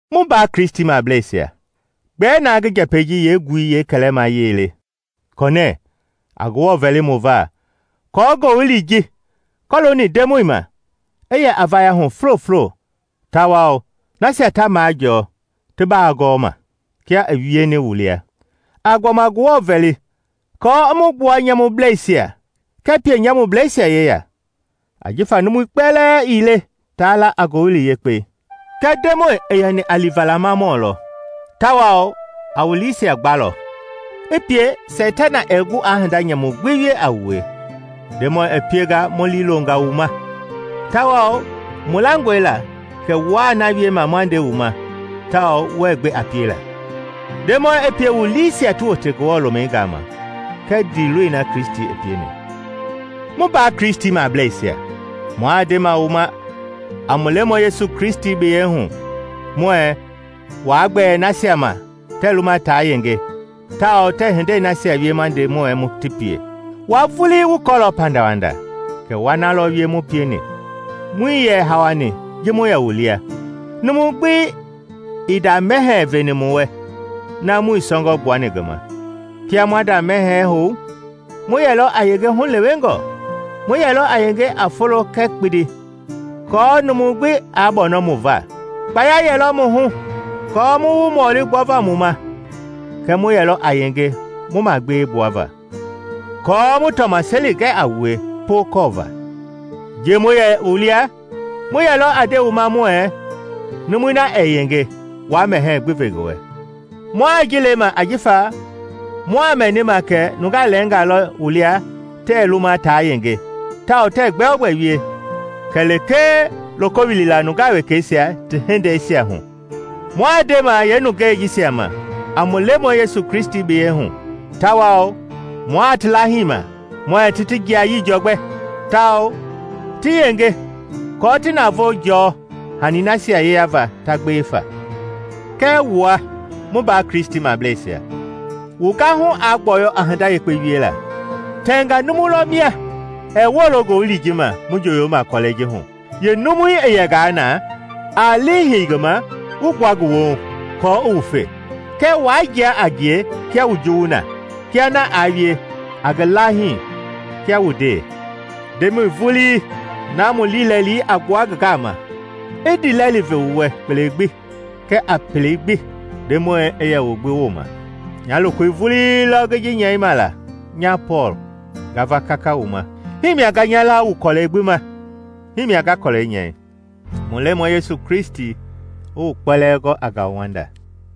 Mu mbaa Kristimableisia, gbɛɛ na ngi njɛpɛi ji yeengui yeekɛlɛmayei le kɔnɛɛ, a Ngewɔ vɛli mu va aako Ngowili ji kɔlooni Ndemɔi ma i yɛ a vaya hu fulofulo tawao nasia ta majɔɔ ti baa gɔɔ ma, kia i wieni wu lia. A gbɔma Ngewɔ vɛli aako i mu gbua nyamublɛisia kɛɛ pienyamubleisia yeya; ajifa numui kpɛlɛɛ ii le taa la a Ngowili Yekpei. Kɛɛ Ndemɔi i yɛni a liivalamamɔ lɔ tawao a wu liisia gbalɔ, i pie Seitana ɛɛ gu aa hinda nyamu gbi wie a wue. Ndemɔi i pienga mu liilonga wu ma, tawao mu langɔe la kɛ wuaa na wiema ma nde wu ma tao wuɛ gbe a piela. Ndemɔi i pie wu liisia ti wote Ngewɔ lomɛi gama kɛɛ ndiiloi na Kristi pieni. Mu mbaa Kristimableisia, mua ndema wu ma a mu Lemɔi Yesu Kristi biyei hu muɛɛ waa gbɛɛ nasia ma tɛɛ luma taa yenge tawao tɛɛ hindei nasia wie ma nde muɛ ti pie. Wua vulii wu kɔɔlɔ pandawanda kɛ wa na lɔ wie mu pieni. Muii yɛ hawani ji mu yɛ wu lia. Numu gbi ii nda mɛhɛɛ veni mu wɛ na muii sɔngɔ gbuani ngi ma. Kia maa nda mɛhɛɛ hou, mu yɛlɔ a yenge hulewengɔ; mu yɛlɔ a yenge a folo kɛɛ kpindi aako numu gbi aa bɔnɔ mu va. Kpaya yɛlɔ mu hu kɔɔ mu wu mɔli gbɔva mu ma kɛɛ mu yɛlɔ a yenge mu magbewe gbua va aako mu tɔmaseli gɛ a wue pookɔɔva. Ji mu yɛ wu lia mu yɛlɔ a nde wu ma muɛɛ, numui na ɛɛ yenge waa mɛhɛɛ gbi ve ngi wɛ. Mua ji lema ajifa muaa mɛnima kɛ nungaa lɛɛngaa lɔ wu lia tɛɛ luma taa yenge tawao tɛɛ gbɛogbɛ wie kɛlee loko wilila nungaa wekɛisia ti yengei hu. Mua ndema yeenungɛi jisia ma a mu Lemɔi Yesu Kristi biyei hu tawao mua ti laahima muɛɛ ti ti jiayii jɔgbɛ tawao ti yenge aako ti navoo jɔɔ hanii nasia yeyava ta gbewe fa. Kɛɛ wua, mu mbaa Kristimableisia, wu gahu aa gbɔyɔ a hinda yekpe wiela. Tɛngaa numu lɔ mia ɛɛ woolo Ngowili ji ma mu njoyoma kɔlɛi ji hu. Yeenumui i yɛngaa na, a lii hei ngi ma wu gbua ngi woohu, aako i wufe. Kɛɛ waa jia a ngie kia wu juwu na: kia na aa wie, a ngi laahii kia wu ndee. Ndemɔi vulii, na mu liilɛli a gbua ngi gama, i ndiilɛli ve wu wɛ kpele gbi kɛɛ a pelei gbi. Ndemɔi i yɛ wu gbi wooma. Nya lokoi vulii lɔ ngi ji nyɛima la: Nya Pɔɔl, nga va kaka wu ma. Himia nga nya laa wu kɔlɛi gbi ma. Himia nga kɔlɛi nyɛi. Mu Lemɔi Yesu Kristi i wu kpɛlɛɛ gɔ a ngauwanda.